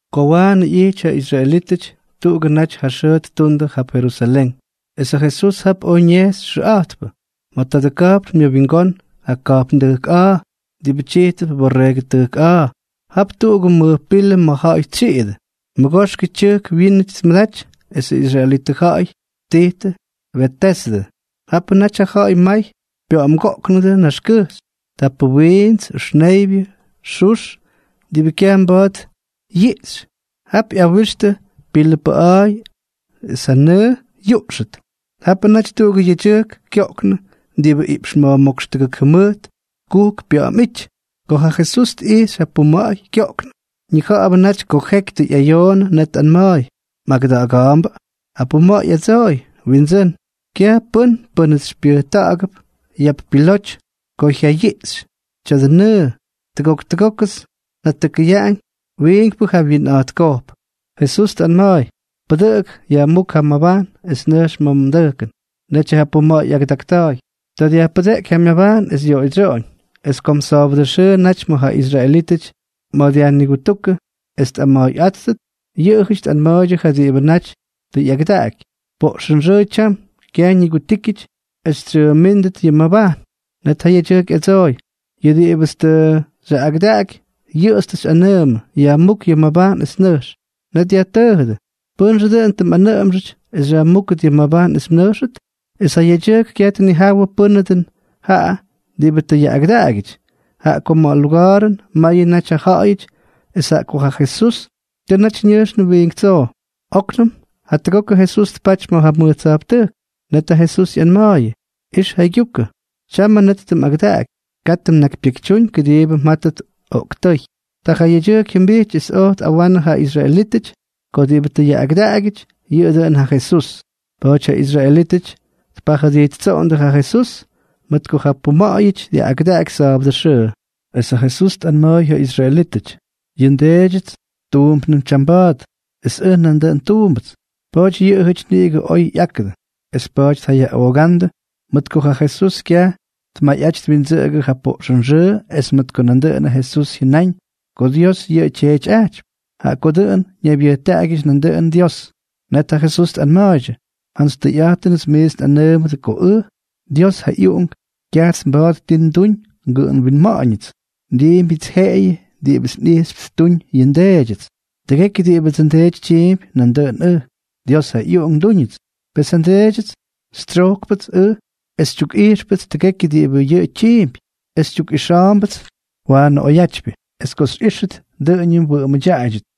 Ko waanʉ ꞌyijty ja israelítʉty tuꞌugʉ naty ja xʉʉ ttundʉ jap Jerusalén, es ja Jesús jap oj ñejxy xʉꞌa̱jtpʉ. Ma̱ tadʉ ka̱jpn myʉwingón ja ka̱jpndʉjk a̱a̱ diꞌibʉ tyijtʉp Borreegʉ Tʉjk A̱a̱, jap tuꞌugʉ mʉj pilʉ ma̱ ja̱ꞌa̱y tsyiꞌidʉ. Mʉgoxkʉ tyʉjk wiin tmʉdaty esʉ israelitʉ ja̱ꞌa̱y ttijtʉ Betesdʉ. Japʉ naty ja ja̱ꞌa̱y may pya̱ꞌa̱mgoꞌknʉdʉ naxkʉjxy. Tapʉ wiints, ʉxneybyʉ, xux, diꞌibʉ kyaj mba̱a̱t yiꞌxy. Jap ꞌyawixtʉ pilʉ paꞌa̱a̱y es ja nʉʉ yuꞌxʉt. Japʉ naty tuꞌugʉ yedyʉjk kyoꞌknʉ diꞌibʉ iꞌpx ma̱jmókx tʉgʉk jʉmʉjt kujk pya̱ꞌa̱m ꞌyity. Ko ja Jesús tꞌijxy ja puma̱ꞌa̱y kyoꞌknʉ, ñija̱ꞌa̱bʉ naty ko jeky tʉ ꞌyayoonʉ, net tꞌanma̱a̱y: —¿Mꞌagʉda̱ꞌa̱ga̱a̱mbʉ? Ja puma̱ꞌa̱y ꞌyadsooy: —Windsʉ́n, kyaj pʉ́n pʉ́nʉts xypyʉjta̱ꞌa̱gʉp yap piloty ko jyayiꞌxy tya̱dʉ nʉʉ. Tʉgok tʉgókʉts njatʉkʉyaꞌañ, wiinkpʉ jawyiinꞌa̱jtkojp. Jesús tꞌanma̱a̱y: —Pʉdʉꞌʉk, yajmúk ja mmabajn es nʉjx ma̱ mdʉjkʉn. Netyʉ ja puma̱ꞌa̱y ꞌyagʉdakta̱a̱y. Ta dyajpʉdeꞌky ja myabajn es yoꞌoydsyoꞌoñ. Es kom sa̱a̱bʉdʉ naty ma̱ ja israelítʉty dyajnigutúkʉ es tꞌama̱a̱yꞌáttʉt, yʉꞌʉjʉty tꞌanma̱a̱ydyʉ ja diꞌibʉ naty tʉ ꞌyagʉdaꞌaky: —Poꞌxʉnxʉʉ tyam. Kyaj ñikutíkyʉty es xytsyʉʉmʉdítʉt yʉ mmabajn. Net ja yedyʉjk ꞌyadsooy: —Yʉ diꞌibʉts tʉ xyaꞌꞌagʉdaꞌaky, yʉꞌʉts tʉ xyꞌanʉʉmʉ: “Yajmúk yʉ mmabajn es nʉjx.” Net yajtʉʉjʉdʉ: —¿Pʉ́nxʉ dʉꞌʉn tʉ mꞌanʉꞌʉmxʉty es xyajmúkʉt yʉ mmabajn es mnʉjxʉt? Es ja yedyʉjk kyaj tnijawʉ pʉ́nʉ dʉn jaꞌa diꞌibʉ tʉ yaꞌꞌagʉdaꞌagyʉty, jaꞌa ko ma̱ ja luga̱a̱rʉn mayʉ naty ja ja̱ꞌa̱yʉty es jaꞌa ko ja Jesús tʉ naty ñʉjxnʉ wiink tsoo. Oknʉm jatʉgokʉ Jesús tpaty ma̱ ja mʉj tsa̱jptʉjk. Net ja Jesús ꞌyanma̱a̱yʉ: —Ix jaygyukʉ. Tyamʉ net tʉ mꞌagʉdaꞌaky. Katʉ mnakypyekytyúñ kʉdiibʉ mjátʉt oꞌktʉ́y. Ta ja yedyʉjk jyʉmbijty es oj tꞌawanʉ ja israelítʉty ko diꞌibʉ tʉ yaꞌꞌagʉdaꞌagyʉty, yʉꞌʉ dʉꞌʉn ja Jesús. Pa̱a̱ty ja israelítʉty tpajʉdijttsoꞌondʉ ja Jesús, mʉt ko ja puma̱ꞌa̱yʉty dyaꞌꞌagʉdaky sa̱a̱bʉdʉ xʉʉ. Es ja Jesús tꞌanma̱a̱y ja israelítʉty: —Yʉ nDeedyʉts tuumpnʉm tyamba̱a̱t, es ʉj nandʉꞌʉn tuumbʉts. Pa̱a̱ty yʉꞌʉjʉty niꞌigʉ oj ꞌyákʉdʉ, es pa̱a̱ty tjayaꞌoogándʉ mʉt ko ja Jesús kyaj tmayꞌaty twindsʉꞌʉgʉ ja poꞌxʉnxʉʉ es mʉt ko nandʉꞌʉnʉ Jesús jyʉnáñ ko Dios yʉꞌʉ tyeetyꞌajtypy, jaꞌa ko dʉꞌʉn ñaybyʉjtaꞌagyʉty nandʉꞌʉn Dios. Net ja Jesús tꞌanma̱a̱ydyʉ: —Jantsy tʉyꞌa̱jtʉnʉts miits nꞌanʉʉmʉdʉ ko ʉj, Dios ja ꞌyUꞌunk, kyajts mba̱a̱t ti nduñ ngʉꞌʉm winma̱ꞌa̱ñʉts. Ndiimbyʉts jeꞌeyʉ diꞌibʉts nꞌijxypy ttuñ yʉ nDeedyʉts. Tʉgekyʉ diꞌibʉdsʉ nDeety tyiimpy, nandʉꞌʉn ʉj, Dios ja ꞌyUꞌunk, ndúñʉts. ’Pes ja nDeedyʉts xytsyojkpʉts ʉj es xytyukꞌijxpʉts tʉgekyʉ diꞌibʉ yʉꞌʉ tyiimpy. Es xytyukꞌixa̱a̱mbʉts waanʉ oyjyatypyʉ. Es ko xyꞌíxtʉt, dʉꞌʉñʉ mwʉꞌʉmʉdyaꞌaydyʉt.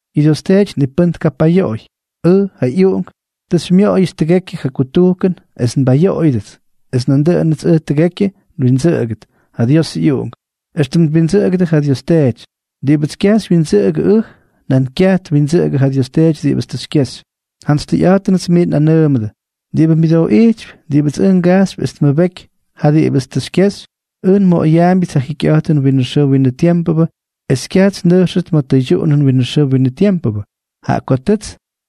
Yʉ Dios Teety ni pʉ́n tkapayoꞌoy. Ʉj, ja ꞌyUꞌunk, tʉ xymyoꞌoyʉts tʉgekyʉ ja kutujkʉn es nbayoꞌoyʉdʉts, es dʉꞌʉnʉts ʉj tʉgekyʉ xywyindsʉꞌʉgʉdʉt, ja Diosʉ ꞌyUꞌunk, éxtʉm twindsʉꞌʉgʉdʉ ja Dios Teety. Diꞌibʉts kyaj xywyindsʉꞌʉgʉ ʉj, nan kyaj twindsʉꞌʉgʉ ja Dios Teety diꞌibʉts tʉ xykyexy. ’Jantsy tʉyꞌa̱jtʉnʉts miits nꞌanʉʉmʉdʉ, diꞌibʉ myʉdooꞌijtypy diꞌibʉts ʉj ngajxypy es tmʉbeky ja diꞌibʉts tʉ xykyexy, ʉj nmoꞌoyaambyʉts ja jikyꞌa̱jtʉn winʉ xʉʉ winʉ tiempʉ, es kyaj ñʉjxʉt ma̱ tʉydyuꞌunʉn winʉ xʉʉ winʉ tiempʉ, jaꞌa ko tʉts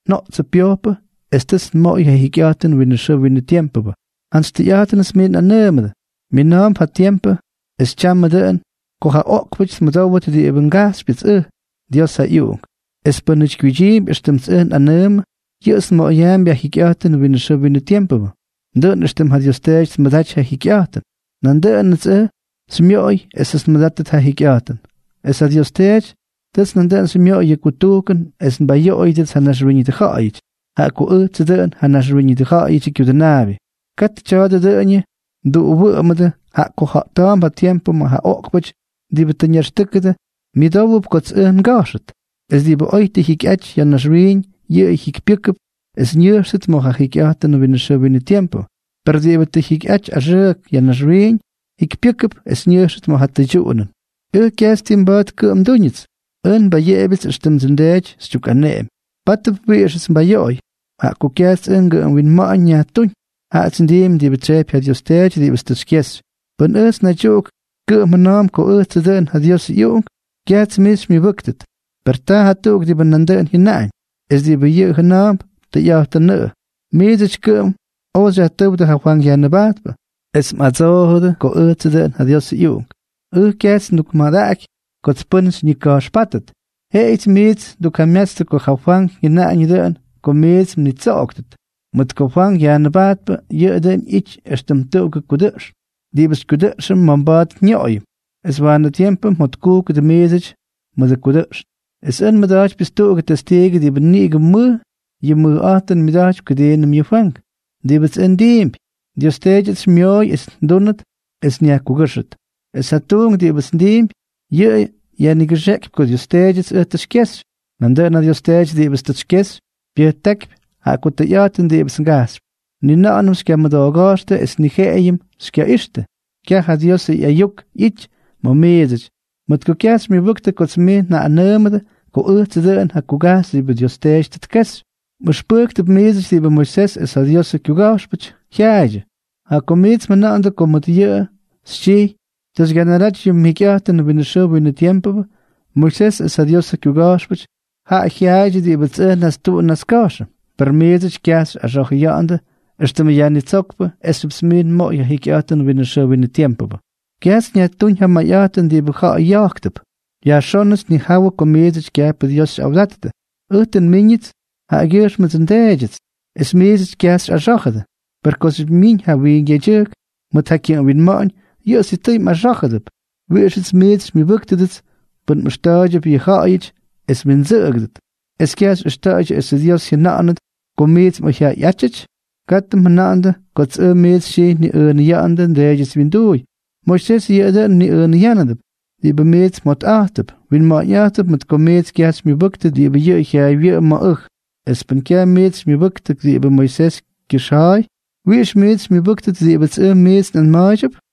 njoꞌtsʉ pyojpʉ es tʉts nmoꞌoy ja jikyꞌa̱jtʉn winʉ xʉʉ winʉ tiempʉ. Jantsy tʉyꞌa̱jtʉnʉts miits nꞌanʉʉmʉdʉ, mina̱a̱mp ja tiempʉ, es tyamʉ dʉꞌʉn, ko ja oꞌkpʉty tmʉdówdʉt diꞌibʉ ngajxypyʉts ʉj, Dios ja ꞌyUꞌunk. Es pʉ́nʉty kyuydyiimpy éxtʉmts ʉj nꞌanʉʉmʉ, yʉꞌʉts nmoꞌoyaampy ja jikyꞌa̱jtʉn winʉ xʉʉ winʉ tiempʉ. Dʉꞌʉn éxtʉm ja Dios Teety tmʉdaty ja jikyꞌa̱jtʉn, nandʉꞌʉnʉts ʉj tʉ xymyoꞌoy esʉts nmʉdátʉt ja jikyꞌa̱jtʉn. Es ja Dios Teety tʉts nandʉꞌʉn xymyoꞌoy yʉ kutujkʉn es nbayoꞌoyʉdʉts ja naxwíñʉdʉ ja̱ꞌa̱yʉty, jaꞌa ko ʉjtsʉ dʉꞌʉn ja Naxwíñʉdʉ Ja̱ꞌa̱yʉdyʉ Kyudʉnaabyʉ. Katʉ tya̱a̱dʉ dʉꞌʉñʉ mduꞌuwʉꞌʉmʉdʉ, jaꞌa ko ja̱ꞌta̱a̱mp ja tiempʉ ma̱ ja oꞌkpʉty diꞌibʉ tʉ ñaxtʉ́kʉdʉ myʉdówʉp kots ʉj nga̱jxʉt, es diꞌibʉ oy tʉ jyikyꞌaty ya̱ naxwiiñ, yʉꞌʉ jikypyʉ́kʉp es ñʉjxtʉt ma̱ ja jikyꞌa̱jtʉn winʉ xʉʉ winʉ tiempʉ, per diꞌibʉ tʉ jyikyꞌaty axʉʉk ya̱ naxwiiñ, jyikypyʉ́kʉp es ñʉjxtʉt ma̱ ja tʉydyuꞌunʉn. ’Ʉj kyajts ti mba̱a̱t kʉꞌʉm ndúñʉts. Ʉj nbayeꞌebyʉts éxtʉmdsʉ nDeety xytyukꞌaneꞌemy. Pátʉp wiꞌixʉts nbayoꞌoy, jaꞌa ko kyajts ʉj ngʉꞌʉm winma̱ꞌa̱ñ nyajtúñ, jaꞌats ndiimpy diꞌibʉ tsyejpy ja Dios Teety diꞌibʉts tʉ xykyexy. Pʉn ʉjts naydyuꞌuk kʉꞌʉm jʉna̱a̱mp ko ʉjtsʉ dʉꞌʉn ja Diosʉ ꞌyUꞌunk, kyajts mij xymyʉbʉ́ktʉt. Per taa jatuꞌuk diꞌibʉ nandʉꞌʉn jyʉnaꞌañ, es diꞌibʉ yʉꞌʉ jʉna̱a̱mp, tʉyꞌa̱jtʉnʉꞌʉ. Miidsʉty kʉꞌʉm oj xyajtʉ́wdʉ ja Fwank Yajnʉbajtpʉ, es mꞌadsoojʉdʉ ko ʉjtsʉ dʉꞌʉn ja Diosʉ ꞌyUꞌunk. Ʉj kyajts ndukmadaꞌaky kots pʉ́n xyñika̱jxpátʉt. Jeꞌeyʉts miits ndukjamyatstʉ ko ja Fwank jyʉnañʉ dʉꞌʉn ko miits mnitsoꞌoktʉt. Mʉt ko Fwank Yajnʉbajtpʉ, dʉꞌʉn yʉꞌʉ ꞌyijty éxtʉm tuꞌugʉ kudʉꞌxn diꞌibʉ xykyudʉꞌxʉm ma̱ mba̱a̱t nyoꞌoyʉm, es waanʉ tiempʉ mjotkujkʉdʉ miidsʉty mʉdʉ kudʉꞌxn. Es ʉj nmʉda̱jtypyʉts tuꞌugʉ testiigʉ diꞌibʉ niꞌigʉ mʉj yʉ mʉjꞌa̱jtʉn tmʉdaty kʉdiinʉm yʉ Fwank. Diꞌibʉts ʉj ndiimpy, Dios Teedyʉts xymyooy es ndúnʉt es nyajkugʉ́xʉt. Es ja tuunk diꞌibʉts ndiimpy, yʉꞌʉ yajnigʉxeꞌkypy ko Dios Teedyʉts ʉj tʉ xykyexy. Nandʉꞌʉn ja Dios Teety diꞌibʉts tʉ xykyexy, pyʉjtákypy jaꞌa ko tʉyꞌa̱jtʉn diꞌibʉts ngajxypy. Ni na̱ꞌa̱nʉm xykyamʉdooga̱jxtʉ es ni jeꞌeyʉnʉm xykyaꞌixtʉ. Kyaj ja Diosʉ ꞌyayuk ꞌyity ma̱ miidsʉty, mʉt ko kyaj xymyʉbʉktʉ kots miits njaꞌꞌanʉʉmʉdʉ ko ʉjtsʉ dʉꞌʉn ja kugajxy diꞌibʉ Dios Teety tʉ tkexy. Mꞌʉxpʉjktʉp miidsʉty diꞌibʉ Moisés es ja Diosʉ kyuga̱jxpʉty jyaaydyʉ, jaꞌa ko miits mjʉna̱ꞌa̱ndʉ ko mʉt yʉꞌʉ xytyijy tʉ xygyanaraty yʉ mjikyꞌa̱jtʉn winʉ xʉʉ winʉ tiempʉ. Moisés es ja Diosʉ kyuga̱jxpʉty, jaꞌa jyaaydyʉ diꞌibʉts ʉj nnastuꞌun nnaska̱jxʉ, per miidsʉty kyajts xyꞌaxa̱jʉya̱ꞌa̱ndʉ éxtʉmʉ Yajnitsókpʉ esxyʉpts miits nmoꞌoy yʉ jikyꞌa̱jtʉn winʉ xʉʉ winʉ tiempʉ. ’Kyajts nyajtúñ ja mʉjꞌa̱jtʉn diꞌibʉ ja̱ꞌa̱y ya̱jktʉp. Yajxónʉts nnijawʉ ko miidsʉty kyajpʉ Dios xyꞌawdattʉ. Ʉj tʉ nmíñʉts yʉꞌʉgyʉjxmʉdsʉ nDeedyʉts, es miidsʉty kyajts xyꞌaxá̱jʉdʉ. Per kooxyʉp myiñ ja wiink yedyʉjk mʉt ja kyʉꞌʉm winma̱ꞌa̱ñ, yʉꞌʉ sitʉy mꞌaxá̱jʉdʉp. ¿Wiꞌixʉts miits xymyʉbʉ́ktʉdʉts pʉn mꞌʉxta̱a̱ydyʉp yʉ ja̱ꞌa̱yʉty es mwindsʉꞌʉgʉdʉt, es kyaj xyꞌʉxta̱ꞌa̱ydyʉ esʉ Dios jyʉna̱ꞌa̱nʉt ko miits mꞌoyjyaꞌayꞌátyʉty? Katʉ mjʉna̱ꞌa̱ndʉ kots ʉj miits xytyijy nniꞌʉʉnʉya̱ꞌa̱ndʉ nDeedyʉts wyinduuy. Moisés yʉꞌʉ dʉꞌʉn mniꞌʉʉnʉyánʉdʉp, diꞌibʉ miits mjotꞌa̱jttʉp. Mniꞌʉʉnʉyánʉdʉp mʉt ko miits kyaj xymyʉbʉktʉ diꞌibʉ yʉꞌʉ jyaaywyʉꞌʉm ma̱ ʉj. Es pʉn kyaj miits xymyʉbʉktʉ diꞌibʉ Moisés kyʉxja̱a̱y, ¿wiꞌix miits xymyʉbʉ́ktʉt diꞌibʉts ʉj miits nꞌanma̱a̱ydyʉp?